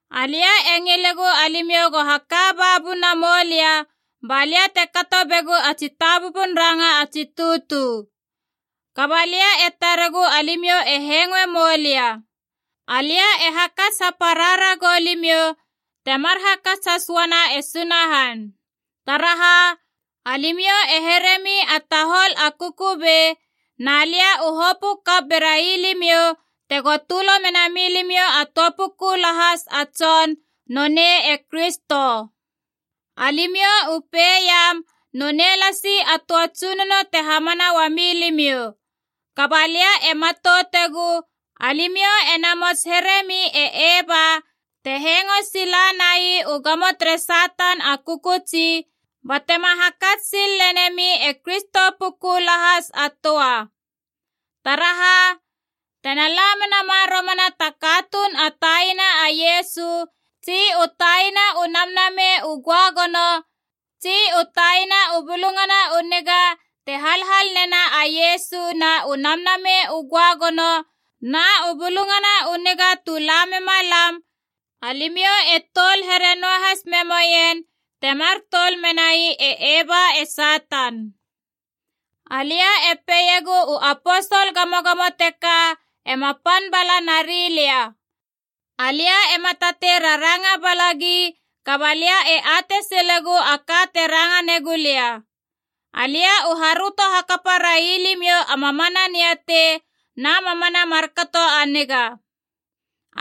Alia e ngilegu alimiou go haka ba buna moulia balia te kato begu a tsitabubun ranga a tsi tutu. Kaba lia e taregu alimiou e hengoe moulia. Alia e hakats hapara ragou limiou temar hakats has uana e Sunahan. Taraha, alimiou e heremi a tahol a kukubei, na lia u hopö kap merai limiou tego tölo mena milimiou a töa puku lahas a tson, nonei e Kristo. Alimiou u peiam nonei lasi a töa Tsunono te hamana uami limiou. Kaba lia e matoutegu, alimiou ena mots heremi e Eva te hengo sila nai u gamo tere Satan a kökötsi, batema hakats sil lenemi e Kristo puku lahas a töa. Taraha! Tena la menama romana ta katuun a taina a Iesu tsi u taina u namnamei u göagono tsi u taina u bulungana u niga te halhal nena a Iesu na u Namnamei u Göagono na u Bulungana u Niga tu la mema lam, alimiou e toul here noahas me moien temar toul menai e Eva e Satan. Alia e peiegu u aposol gamogamo teka ema pan bala nari lia. Alia ema tatei raranga balagi, kaba lia e atei silegu a ka te ranga negu lia. Alia u haröto hakapa rai limiou a mamana niatei na mamana markato a niga.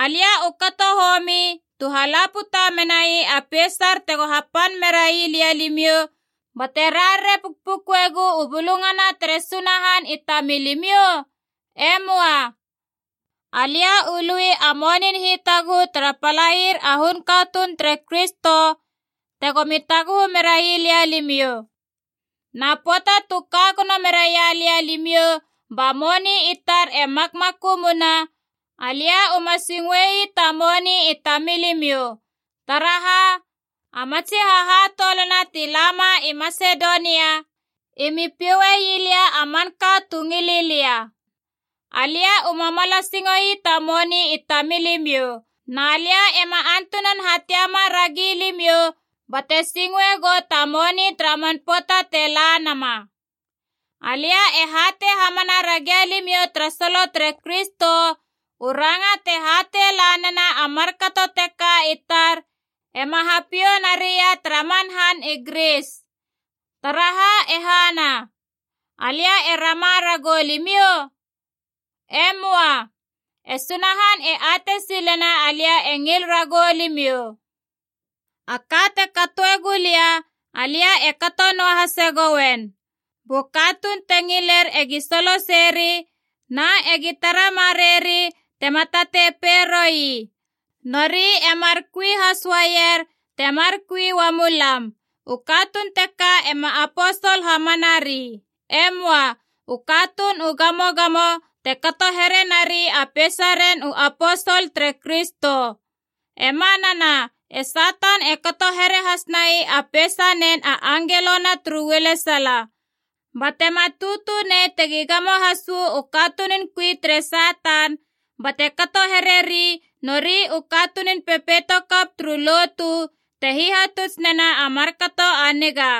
Alia u kato homi, tu hala puta menai a peisar tego hapan merai lia limiou bate rarare pukpukuegua u Bulungana tere Sunahan i tamilimiou? E möa. Alia u lui a monin hitaguhu tara palair a hun katuun tere Kristo tegomi taguhu merai lia limiou. Na pöata tu ka gono meraia lia limiou ba moni i tar e makmakumuna, alia uma singoe ii ta moni i tamilimiou. Taraha, a matsi hahatoulana ti lama i Masedonia i mi pioue ii lia a manka tu ngili lia. Alia uma mala singoe ii ta moni i tamilimiou, na lia ema antunan hatiama ragi limiou bate singoe gou ta moni tara man pöata te la nama. Alia e hatei hamana ragia limiou tara solo tere Kristo, u ranga te hatei la nena a markato teka i tar ema hapiou naria tara man han i Gris. Taraha e hana? Alia e rama ragou limiou? E möa. E Sunahan e atei silena alia e ngil ragou limiou. A ka te katoe gulia, alia e kato noahase gouen. Bu katuun te ngiler egi soloseri, na egi tara mareieri tema tatei peiroi, nori e mar kui has uaier temar kui uamu lam. U katuun teka ema aposol hamanari. E möa. U katuun u gamogamo te kato here nari a peisaren u aposol tere Kristo. E manana, e Satan e kato here has nai a peisanen a angelona turu ualesala. Ba tema tutu nei tegi gamo has uu katunun kui tere Satan bate kato hereri nori u katunun pepeito kap turu lotu te hihatuts nena a markato a niga.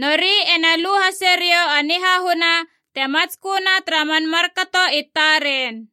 Nori ena lu hase riou a nihahuna te matsköna tara man markato i taren.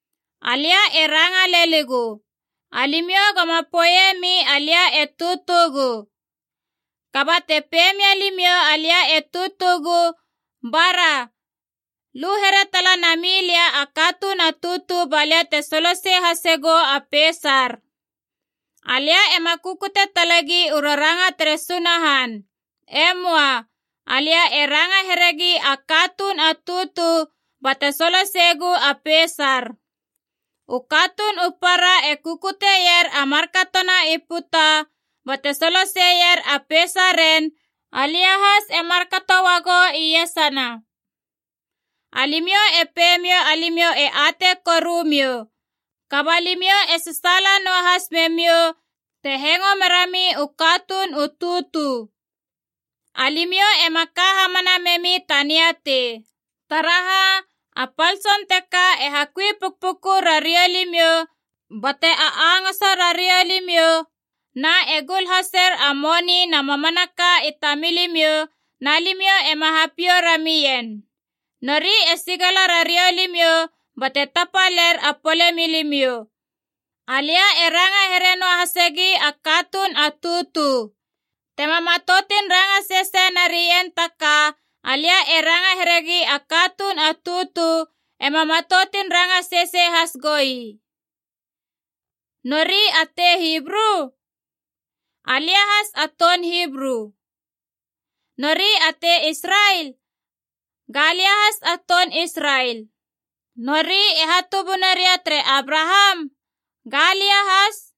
Alia e ranga leligu, alimiou goma poeiemi alia e tutugu. Kaba te pei mia limiou alia e tutugu, bara, lu here tala namilia a katuun a tutu balia te solosei hasegu a peisar. Alia ema kukute talegi u raranga tere Sunahan. E möa. Alia e ranga heregi a katuun a tutu bate soloseiegu a peisar. U katuun u para e kukuteier a markatona i puta bate solo seseier a peisaren, alia has e markato uagou iesana. Alimiou e peimiou alimiou e atei korumiou, kaba limiou e sasaala noahas memiou te hengo merami u katuun u tutu. Alimiou ema ka hamana memi ta niatei. Taraha, a pal tson teka e hakui pukpuku rariou limiou bate a angoso rariou limiou na e gul haser a moni na mamanaka i tamilimiou, na alimiou ema hapiou ramien. Nori e sigala rariou limiou bate tapaler a pole milimiou. Alia e ranga here noa hasegi a katuun a tutu. Tema matoutun ranga sesei narien ta ka, alia e ranga heregi a katuun a tutu, ema matoutun ranga sesei has goi. Nori a tei Hibru? Alia has a toun Hibru. Nori a tei Israel? Ga lia has a toun Israel. Nori e hatubuna ria tere Abraham? Ga lia has.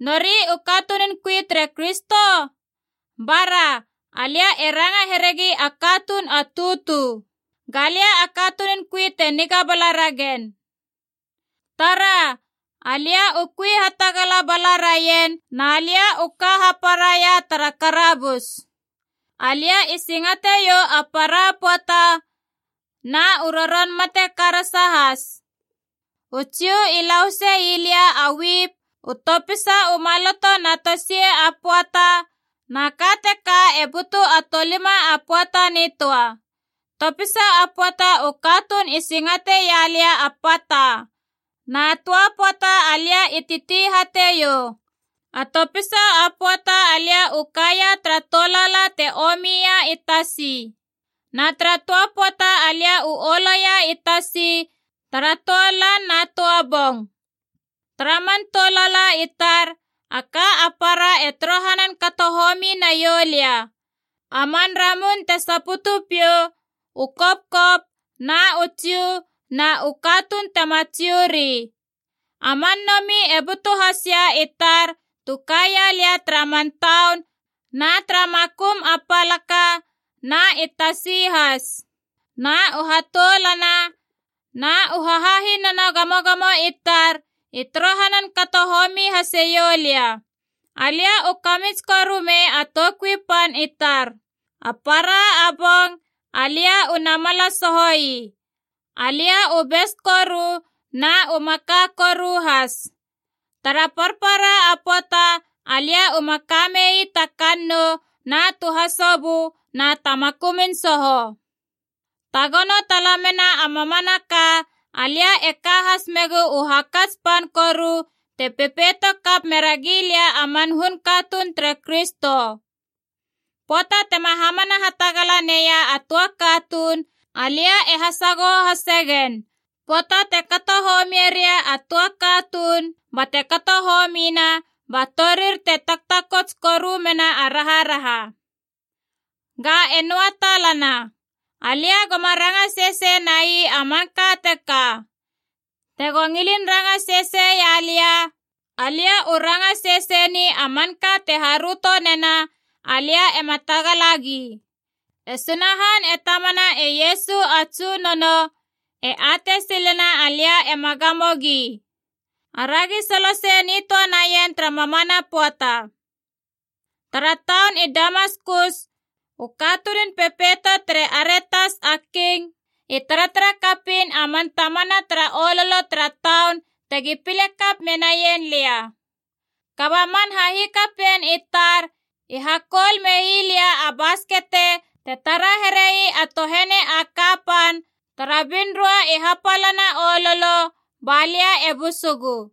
Nori u katunun kui tere Kristo? Bara, alia e ranga heregi a katuun a tutu. Ga lia a katunun kui te niga bala ragen. Tara, alia u kui hatagala bala raien na lia u ka haparaia tara karabus. Alia i singateiou a para pöata, na u roron mate karasa has. U Jiu i lahuse ii lia a wipb u topisa u maloto na tosiec a pöata na ka teka e butu a tolima a pöata nitöa. Topisa a pöata u katuun i singate ii lia a pata. Na töa pöata alia i titi hateiou. A topisa a pöata alia u ka ia tara tolaala te omi ia i tasi. Na tara töa pöata alia uolo ia i tasi tara töa lan na töa bong. Tara man tou lala i tar, a ka a para e torohanan kato homi naiou lia: a man ramun te saputu piou, u kopkop, na u Jiu, na u katuun tema Jiu ri. A man nomi e butu has ia i tar tu kaia lia tara man taun na tara makum a palaka na i tasi has. Na u hatoulana na u hahahinana gamogamo i tar i torohanan kato homi haseiou lia. Alia u kamits koru mei a toukui pan i tar. A para a bong alia u namala soho ii. Alia u bes koru na u maka koru has. Tara parpara a pöata alia uma kamei ta kannou na tu hasobö na ta makumun soho. Tagono talamena a mamanaka, alia e ka has megu u hakats pan koru te pepeito kap mera gilia a man hun katuun tere Kristo. Pöata tema hamana hatagala neia a töa katuun, alia e hasagoho hase gen. Pöata te kato homie ria a töa katuun bate kato homina, ba torir te taktakots koru mena a raharaha. Ga e noa talana. Alia goma ranga sesei nai a manka teka. Tego ngilin ranga seseia lia, alia u ranga sesei ni a manka te haröto nena alia ema tagalagi. E Sunahan e Tamana e Iesu a Tsunono e atei silena alia ema gamo gi. Aragi solosei nitöa naien tara mamana pöata! Tara taun i Damaskus, u katunun pepeito tere Aretas a king i taratara kapiin a man tamana tara ololo tara taun tegi pile kap menaien lia. Kaba man hahikapien i tar i hakoul mei lia a baskete te tara here ii a tohene a kapan tara binroa i hapalana ololo, ba lia e busugu.